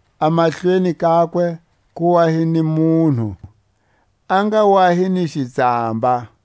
A mahlweni kakwe ku wa hi ni munhu a nga wa hi ni xitsamba.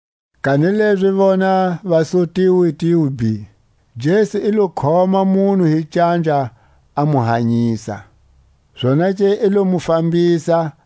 Kanilezi vona va su tiwitiwi bhi! Jesu i lo khoma munhu hi canja, a mu hanyisa. Zonake i lo mu fambisa,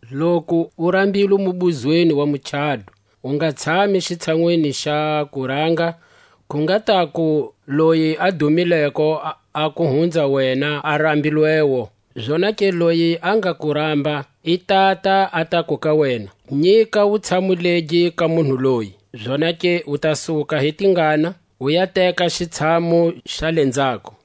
Loku u rambilwe mubuzweni wa muchado, u nga tshami xitshanwini xa kuranga; ku nga taku loyi a dumileko a ku hunza wena a rambilwewo; zonake loyi a nga ku ramba, i tata a taku ka wena: Nyika wutshamu legi ka munhu loyi; zonake u ta suka hi tingana, u ya teka xitshamu xa lenzhako.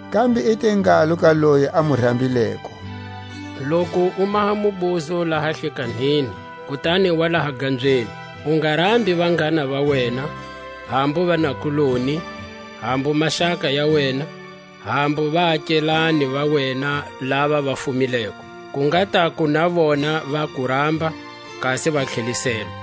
Kambe i te ngalo ka loyi a mu rambileko: Loku u maha mubuzo laha hlikanhini, kutani wa laha gambyeni, u nga rambi vanghana va wena, hambu vanakuloni, hambu maxaka ya wena, hambu vaakelane va wena lava va fumileko; ku nga taku na vona va ku ramba, kasi wa tlheliselwa.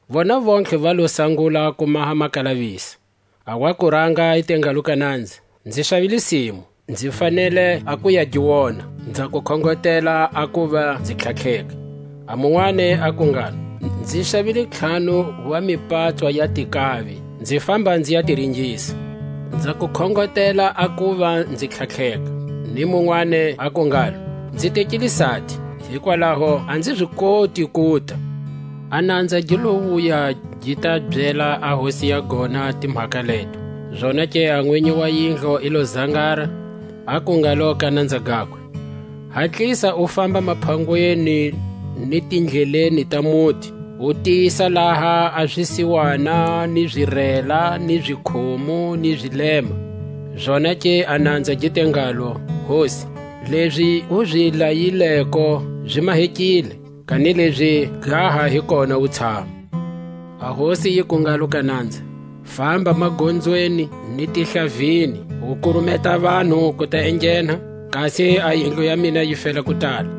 Vona vontlhe va lo sangula ku maha makalavisa. A wa kuranga i te ngalo ka nanza: Nzi xavile simu, nzi fanele a ku ya gi wona; nza ku khongotela a kuva nzi tlhatlheka. A munwani aku ngalo: Nzi xavile ntlhanu wa mipatswa ya tinkavi, nzi famba nzi ya ti ringisa; nza ku khongotela a kuva nzi tlhatlheka. Ni munwani aku ngalo: Nzi tekile sati, hikwalaho a nzi zi koti kuta. A nanza gi lo wuya, gi ta byela a hosi ya gona timhaka leto. Zonake a nwinyi wa yindlu i lo zangara, aku ngalo ka nanza gakwe: Hatlisa u famba maphangweni ni tindleleni ta muti, u tisa laha a zisiwana, ni zirela, ni zikhumu ni zilema. Zonake a nanza gi te ngalo: Hosi, lezi u zi layileko zi mahekile, kanilezi ga ha hi kona wutshamu. A hosi yiku ngalo ka nanza: Famba magonzweni ni tihlavini, u kurumeta vanhu ku ta enghena, kasi a yindlu ya mina yi fela ku tala.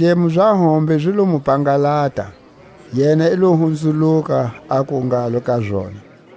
A zidlemo za hombe zi lo mu pangalata; yena i lo hunzuluka, aku ngalo ka zona: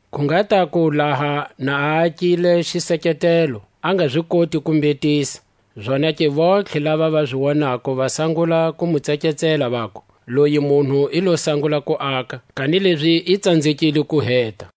Ku nga taku, laha na a akile xiseketelo, a nga zi koti ku mbhetisa, zonake vontlhe lava va zi wonako va sangula ku mu tseketsela, vaku: Loyi munhu i lo sangula ku aka, kanilezi i tsanzekile ku heta.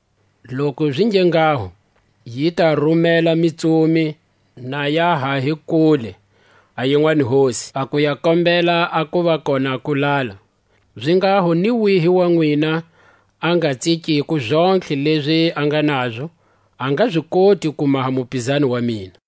Loku zi nge nghaho, yi ta rumela mitsumi, na ya ha hi kule a yinwani hosi, a ku ya kombela a kuva kona kutala. Zinghaho ni wihi wa nwina a nga tsikiko zontlhe lezi a nga nazo, a nga zi koti ku maha mupizani wa mina.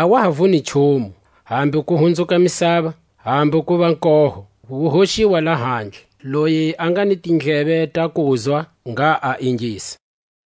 A wa ha vuni nchumu, hambu ku hunzuka misava, hambu kuva koho; wu hoxiwa lahandle. Loyi a nga ni tindleve ta kuzwa, ngha a ingisa.